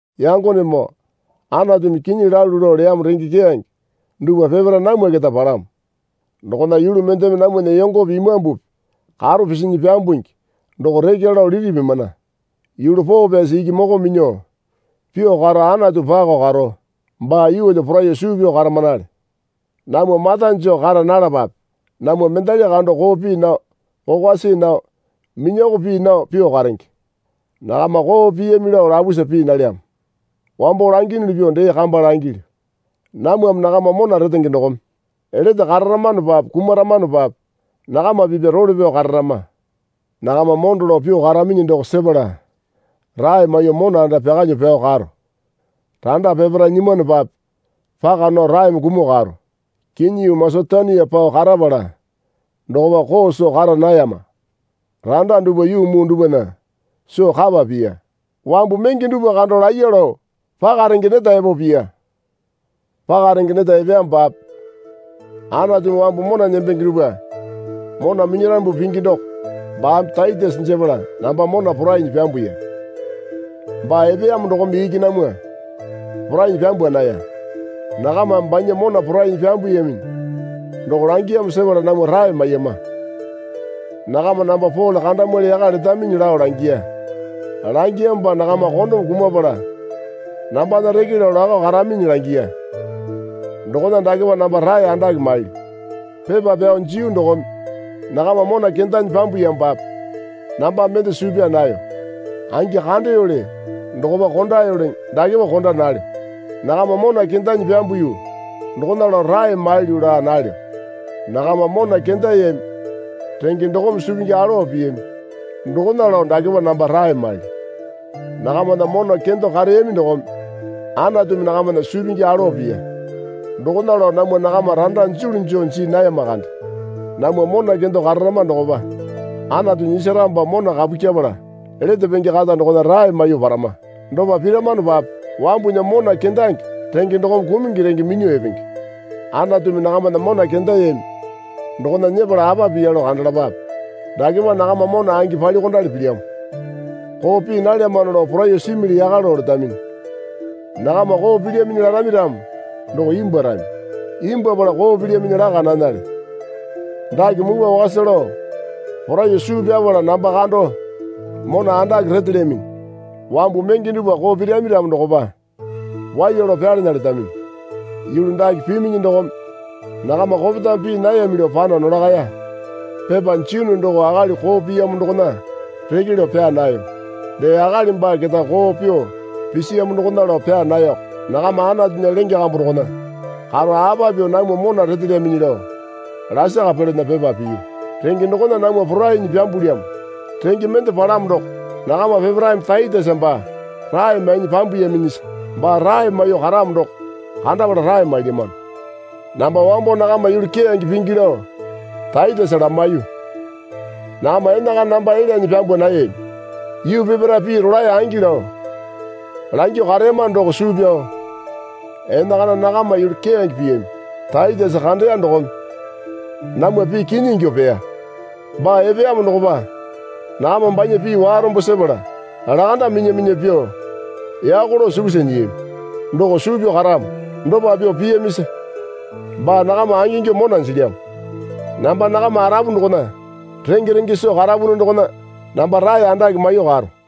Yangonemoo Anatumi kinyi lalu lao leyamo renge keyange dupwa peparae namwa keta palamo. Dokona yulu mendeme namwana yongope imambupi karo pisinyi pyambungi doko rekya lao liti pimana. Yulu poo pyasi iki moko minyuo pyuo karo Anatu pako karo baa yeelyo poraiyuo suu pyao karamanale. Namwa mata joo kara nalapape. Namwa mendali kando koo pii nao kokwa see nao minyoko pii nao pyuo karenge. Nakama koo piyami lao lapusa pii nalyamo. Wambo langiyunuli pyuo dee kamba langilyu. Namwame nakama mona retenge dokome lete kararamanopape kumaramanopape nakama pipya role pyao kararama. Nakama mondo lao pyuo karaminyi doko sepala rae maiyuo mona anda pyakalyuo pyao karo. Randa peparae nyimwanopape paka nao raeme kumuo karo. Kinyi yuu Masetonia pao karapala dokopa koo soo kara nayama. Randa dupwa yuu muu dupwana soo kapa piya. Wambu menge dupwa kando laiya lao paka renge neta epo piya. Paka renge neta epeyamopape Anatumi wambu mona nembenge dupwa mona minyarambu pingi doko baame Taitesa jepala namba mona porainyi pyambuya. Baa epeyamo dokome iki namwa porainyi pyambwa naya. Nakamame banya mona porainyi pyambuyaminyi doko langiyamo sepala namwa rae maiyama. Nakama namba Pole kandamwali yaka letaminyi lao langiya. Langiyamopa nakama kondome kumapala nambana reke lao lakao karaminyi langiya. Dokona dakepa namba rae andake mailyu. Pepa pyao jiyu dokome nakama mona kendanyi pyambuyamopape namba mende suu pyaa nayo. Angi kandeyoli dokopa kondayoliŋi dakepa konda nalyo. Nakama mona kendanyi pyambuyu dokona lao rae mailyu laa nalyo. Nakama mona kendayami renge dokome suu pingi alowa piyami dokona lao dakepa namba rae mailyu. Nakamana mona kendo kareyami dokome Anatumi nakamana suu pingi alowa piya. Dokona lao namwa nakama randa julu joo jii nayama kande. Namwa mona kendo kararama dokopa Anatu nyisaramopa mona kapu kyepala lete penge kata dokona rae maiyuo parama. Dopa piramanopape wambunya mona kendange renge dokome kumungi renge minyuo epenge. Anatumi nakamana mona kendayami dokona nyepala apa piya lao kandalapape. Dakepa nakama mona angi palyuokondali pilyamo. Koo pii nalyamano lao poraiyuo simili yaka lao letaminyi. Nakama koo pilyaminyi larami ramo doko imbwuarami. Imbwuapala koo pilyaminyi laka nanale. Dake mupwa wakasa lao poraiyuo suu pyapala namba kando mona andake retelyaminyi. Wambu menge dupwa koo pirami ramo dokopa waiya lao pyalana letaminyi. Yulu dake piminyi dokome nakama kopetame pii nayami lao pano nolakaya. Pepa jiyunu doko akali koo piyamo dokona reke lao pyaa nayo. Dee akali baa keta koo pyuo pisiyamo dokona lao pyaa nayoko. Nakama Anatunya lenge kambu dokona karo apa pyuo namwa mona retelyaminyi lao lasaka pelana pepa piyu. Renge dokona namwa porainyi pyambulyamo. Renge mende palamo doko nakama peparaeme Taitesa baa rae mainyi pyambuyaminyisa baa rae maiyuo karamo doko kandapala rae mailyamano. Namba wambo nakama yulu keyange pingi lao Taitesa lamaiyu. Nakama enakana namba elyanyi pyambwa nayami. Yuu peparae pii rolae angi lao langyuo kareyama doko suu pyao enakana nakama yulu keyange piyami Taitesa kandeya dokome namwa pii kinyi ingyuo peya. Baa epeyamo dokopa nakama banya pii warombo sepala lakanda minya minya pyuo yako lao sukusa nyiyami doko suu pyaro karamo. Dopa pyuo piyamisa baa nakama angingyuo mona jilyamo. Namba nakama arapu dokona renge renge soo karapunu dokona namba rae andake maiyuo karo.